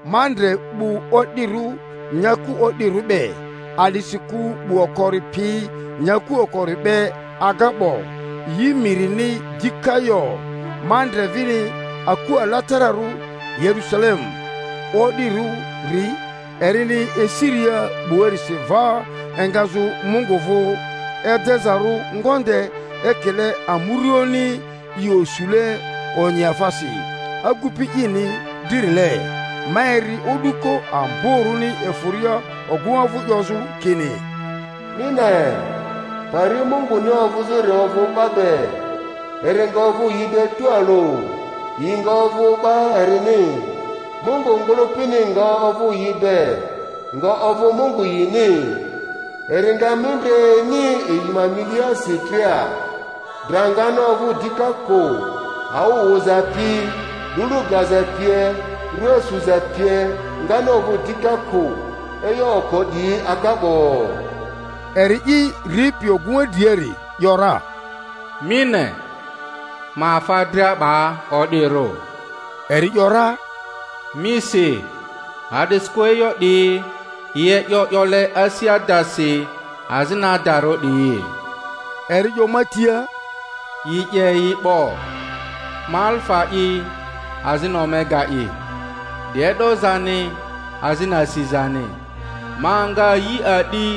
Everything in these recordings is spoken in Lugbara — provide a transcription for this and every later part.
Ma ndre 'bu o'dirᴜ nyaku o'dirᴜ be; a'disikᴜ 'bu okori pi nyaku okori be aga 'bo, yi mirini dika yo. Ma ndre vini aku alatararᴜ, Yerusalemu o'dirᴜri, erini esiria 'buarisi va engazᴜ Mungu vᴜ, edezarᴜ ngonde ekile amuruoᴜni i osule onyiafasi agupi ini dririle; ma eri o'duko amborᴜni efᴜria ogᴜŋa vᴜ 'yozᴜ kini, Mi ne, pari Munguni ovᴜzᴜri ovᴜ 'ba be, eri nga ovᴜ yi be tualᴜ, yi nga ovᴜ 'ba erini, Mungu ngᴜlᴜpini nga ovᴜ yi be, nga ovᴜ Mungu yini; eri nga mindre ini yi ma miliasi dria, dra ngani ovᴜ dika kᴜ, awᴜ wᴜza pi lulu gaza pie, rua suza pie, ngani ovᴜ dika kᴜ; e'yo oko 'diyi aga 'bo. Eri'i ripi ogᴜŋa driari ‘yora, Mi ne, ma afa dria 'ba o'dirᴜ. Eri ‘yora, Mi si, a'disikᴜ e'yo 'diyi yi e'yo 'yole asi adasi azini adarᴜ 'diyi. Eri 'yo ma tia, Yi 'ye yi 'bo! Ma Alifa'i azini Omega'i, 'di e'dozani azini asizani. Ma nga yi a'di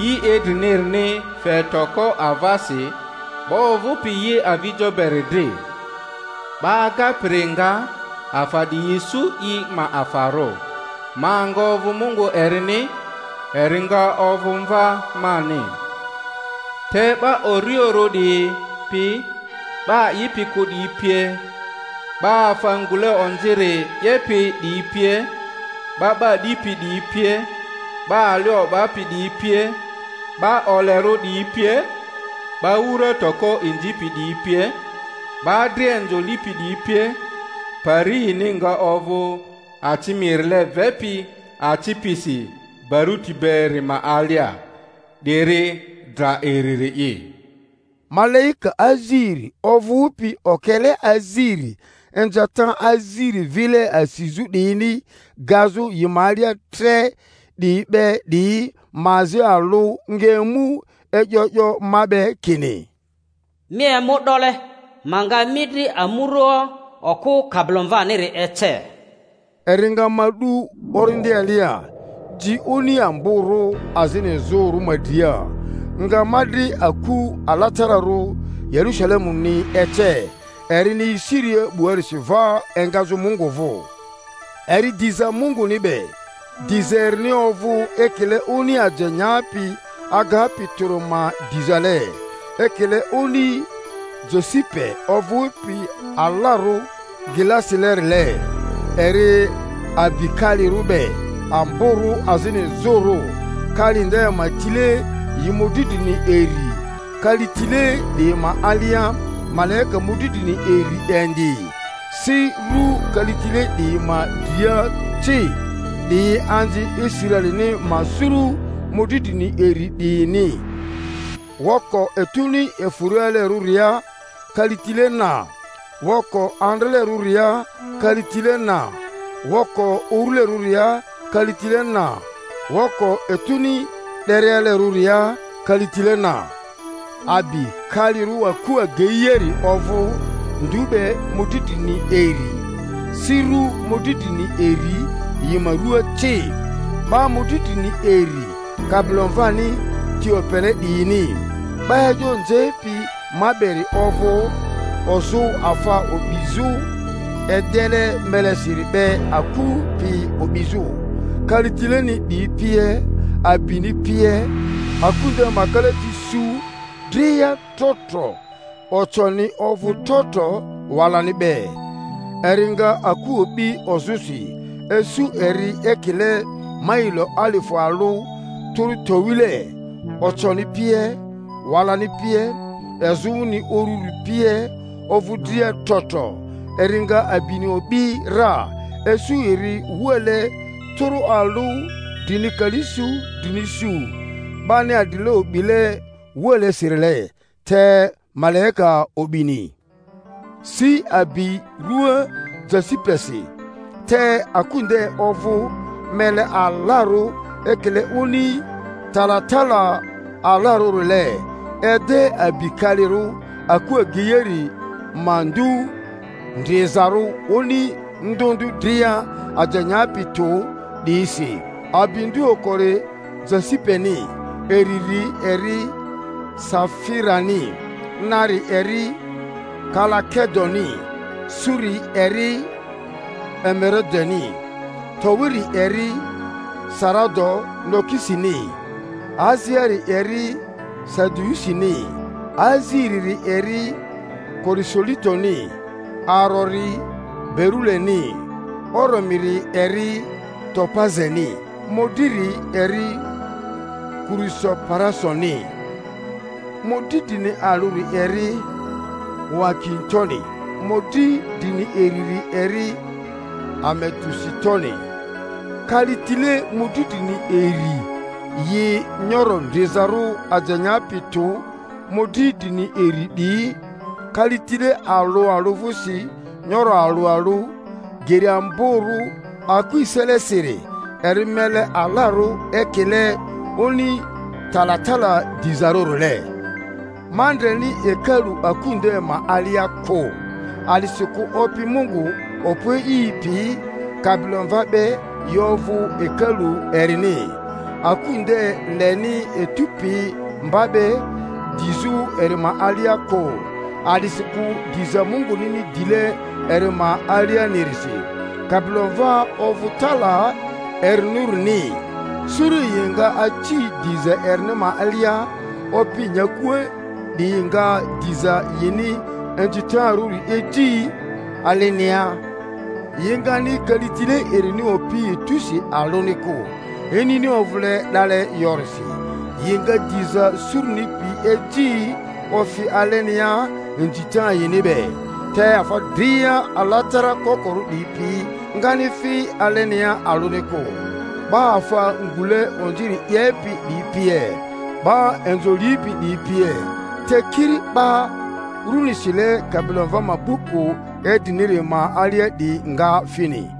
yi idrinirini fe toko avasi 'ba ovᴜpi yi avijo beri dri. 'Ba agapiri nga afa 'diyi isu i ma afarᴜ, ma nga ovᴜ Mungu erini, eri nga ovᴜ mva mani. Te 'ba urioᴜrᴜ 'diyi pi, 'ba a'ipi kᴜ 'diyi pie, 'ba afa ngule onziri 'yepi 'diyi pie, 'ba 'ba 'dipi 'diyi pie, 'ba ali o'bapi 'diyi pie, 'ba olerᴜ 'diyi pie, 'ba wura toko inzipi 'diyi pie, 'ba dria inzo lipi 'diyi pie, pari yini nga ovᴜ aci mirile vepi aci pisi barᴜti beri ma alia; 'diri dra iriri'i. Malaika aziri ovᴜpi okele aziri inzata aziri vile asizᴜ 'diyini gazᴜ yi ma alia tre 'diyi be 'diyi ma azi alᴜ nga emu e'yo 'yo ma be kini, Mi emu 'dole, ma nga mi dri amurᴜoᴜ, okᴜ Kabilomvaniri ece. Eri nga ma 'du Orindi alia, ji oni amborᴜ azini izᴜrᴜ ma dria, nga ma dri aku alatararᴜ Yerusalemuni ece, erini esiria 'buarisi va engazᴜ Mungu vᴜ, eri diza Munguni be, diza erini ovᴜ ekile oni aje nyapi agapi tᴜri ma dizale, ekile oni jasipe ovᴜpi alarᴜ glasilerile. Eri abi kalirᴜ be amborᴜ azini izᴜrᴜ, kali nde ma tile yi mᴜdri drini iri, kalitile 'diyi ma alia malaika mᴜdri drini iri indi; si ru kalitile 'diyi ma dria ci, 'diyi anzi Israelini ma suru mᴜdri drini iri 'diyini; woko etuni efᴜrialerᴜria kalitile na, woko andralerᴜria kalitile na, woko urulerᴜria kalitile na, woko etuni 'derialerᴜria kalitile na. Abi kalirᴜ aku ageiari ovᴜ ndu be mᴜdri drini iri, si ru mᴜdri drini iri yi ma ruaa ci, 'ba mᴜdri drini iri Kabilomvani ti opele 'diyini. 'Ba e'yo nzepi ma beri ovᴜ ozᴜ afa o'bizᴜ edele melesiri be aku pi o'bizᴜ, kalitileni 'diyi pie, abini pie. Aku nde ma kalati su dria trotro, oconi ovᴜ trotro walani be; eri nga aku o'bi ozᴜsi, isu eri ekile mailo alifᴜ alᴜ tᴜrᴜ towile; oconi pie, walani pie, izᴜni ururi pie ovᴜ dria trotro. Eri nga abini o'bi ra, isu eri wuale tᴜrᴜ alᴜ drini kali su drini su, 'bani adrile o'bile wualesirile, te malaika o'bini. Si abi rua jasi-pesi, te aku nde ovᴜ mele alarᴜ ekile oni talatala alarᴜrile. Ede abi kalirᴜ aku ageiari ma ndu ndrizarᴜ oni ndᴜ ndᴜ dria aje nyapi tᴜ 'diyisi; abi ndu okori jasipeni, iriri eri safirani, nari eri kalakedoni, suri eri emerodeni, towiri eri sarado-nukisini, aziari eri sadiusini, aziriri eri kurusolitoni, arori beruleni, oromiri eri topazeni, mᴜdriri eri kurusoparasoni, mᴜdri drini alᴜri eri huakintoni, mᴜdri drini iriri eri ametusitoni. Kalitile mᴜdri drini iri yi nyoro ndrizarᴜ aje nyapi tᴜ mᴜdri drini iri 'diyi, kalitile alᴜ alᴜ vᴜsi nyoro alᴜ alᴜ, geri amborᴜ aku eselesiri eri mele alarᴜ, ekile oni talatala dizarᴜrile. Ma ndreni hekalu aku nde ma alia kᴜ, a'disikᴜ Opi Mungu Okpo E'i pi Kabilomva be yi ovᴜ hekalu erini. Aku nde leni etᴜ pi mba be dizᴜ eri ma alia kᴜ, a'disikᴜ diza Mungunini dile eri ma alianirisi, Kabilomva ovᴜ tala erinirᴜni. Suru yi nga aci diza erini ma alia; opi nyakua 'diyi nga diza yini inzitarᴜri eji alenia, yi ngani kalitile erini opi etusi alᴜni kᴜ—inini ovᴜle 'dale yorisi; yi nga diza suruni pi eji ofi alenia inzita yini be. Te afa dria alatara kokorᴜ 'diyi pi ngani fi alenia alᴜni kᴜ, 'ba afa ngule onziri 'yepi 'diyi pie, 'ba inzo lipi 'diyi pie, te kiri 'ba runi sile Kabilomva ma buku idriniri ma alia 'diyi nga fini.